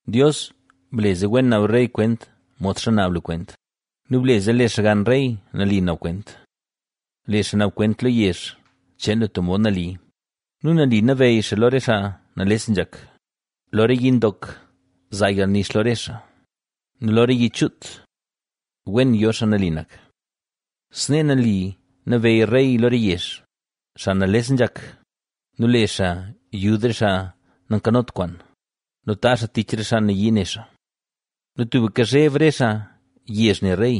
Dios, ble zee wen naab rey kwent, modxa naab lu kwent nu ble zee lee xaa xgann rey nali naab kwent. Lee xaa naab kwent lo yezh cheen lu tub mod nali nu nali nabeyy xaa lo re xaa nales nzhak. Lo re yi ndok zaa yalnix lo re xaa nu lo re yi chuut wen yo xaa nali nak. Snee nali nabeyy rey lo re yezh, xaa nales nzhak nu le xaa yud re xaa nankanot kwaan nu taazh xaa tich re xaa nayii ne xaa. Nu tubka zheb re xaa yezh ne rey,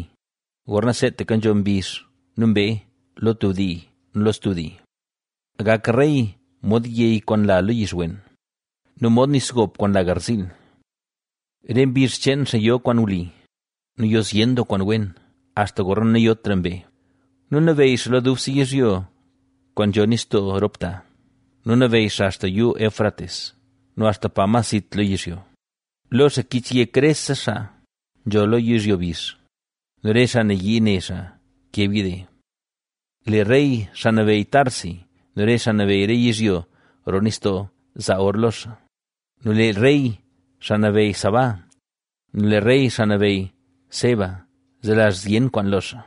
gorna seetaka nzho mbizh nu mbee lo tub dii nu lo stub dii. Gak rey mod yey kwaan nla lo yix wen nu mod nis gop kwaan nla garziil. Re mbizh cheen xaa yo kwaan wli nu yo zyen doo kwaan wen, axta gorna nayotra mbee. Nu nabeyy xaa lo dubse yizhyo kwaan nzho nistoo rop ta nu nabeyy xaa axta Yuu Éufrates, nu axta pa mas zit lo yizhyo. Lo xaa kich yek rese xaa nzho lo yizhyo bizh nu re xaa nayii ne xaa keb yide. Lee rey, xaa nabeyy Tarsis nu re xaa nabeyy re yizhyo roo nistoo zaa or lo xaa, nu lee rey, xaa nabeyy Sabá, nu lee rey, xaa nabeyy Seba selazh zyen kwaan lo xaa.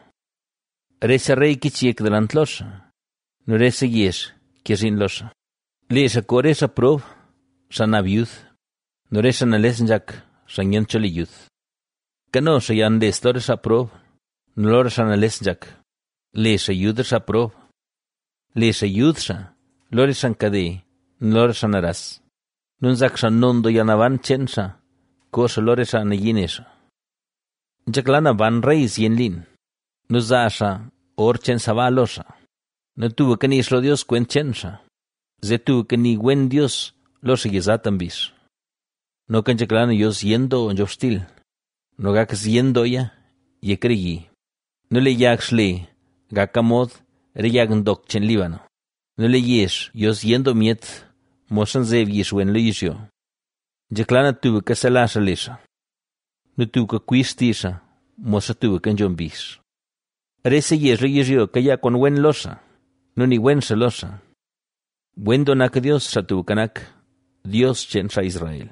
Rese rey kich yek delant lo xaa; nu rese yezh ke zhiin lo xaa. Lee xaa koo re xaa prob, xaa naab yud nu re xaa nales nzhak, xaa nyent cho le yud. Kano xaa yalnles lo re xaa prob nu lo re xaa nales nzhak; le xaa yud re xaa prob. Le xaa yud xaa lo re xaa nkade nu lo re xaa naras nu nzak xaa non doo yalnaban cheen xaa koo xaa lo re xaa nayii ne xaa. Nzhekla na ban rey zyen liin nu zaa xaa or cheen Sabá lo xaa nu tubka nii xaa lo Dios kwent cheen xaa, zee tubka nii wen Dios lo xaa yizata mbizh. Noka nzhekla na yo zyen doo nzhobxtil nu gak zyen dooya yek re yi nu lee yag xle gaka mod re yag ndok cheen Líbano nu lee yezh yo zyen doo myet modxa nzeb yix wen lo yizhyo. Nzhekla na tubka selazh xaa le xaa nu tubka kwib xtizh xaa modxa tubka nzho mbizh. Rese yezh lo yizhyo kayaa kwaan wen lo xaa nu nii wen xaa lo xaa. Wen doo nak Dios, Xaa Tubka Nak, Dios cheen xaa Israel,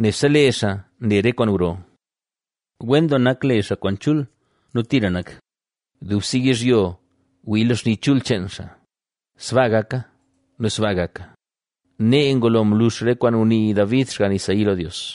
nebse lee xaa nle re kwaan gro. ¡Wen doo nak le xaa kwaan chul nu tira nak! ¡Dubse yizhyo wii lo xni chul cheen xaa! ¡Sbaa gaka nu sbaa gaka! Nee ngulo mlux re kwaan ngunii David, xgann Isaí lo Dios.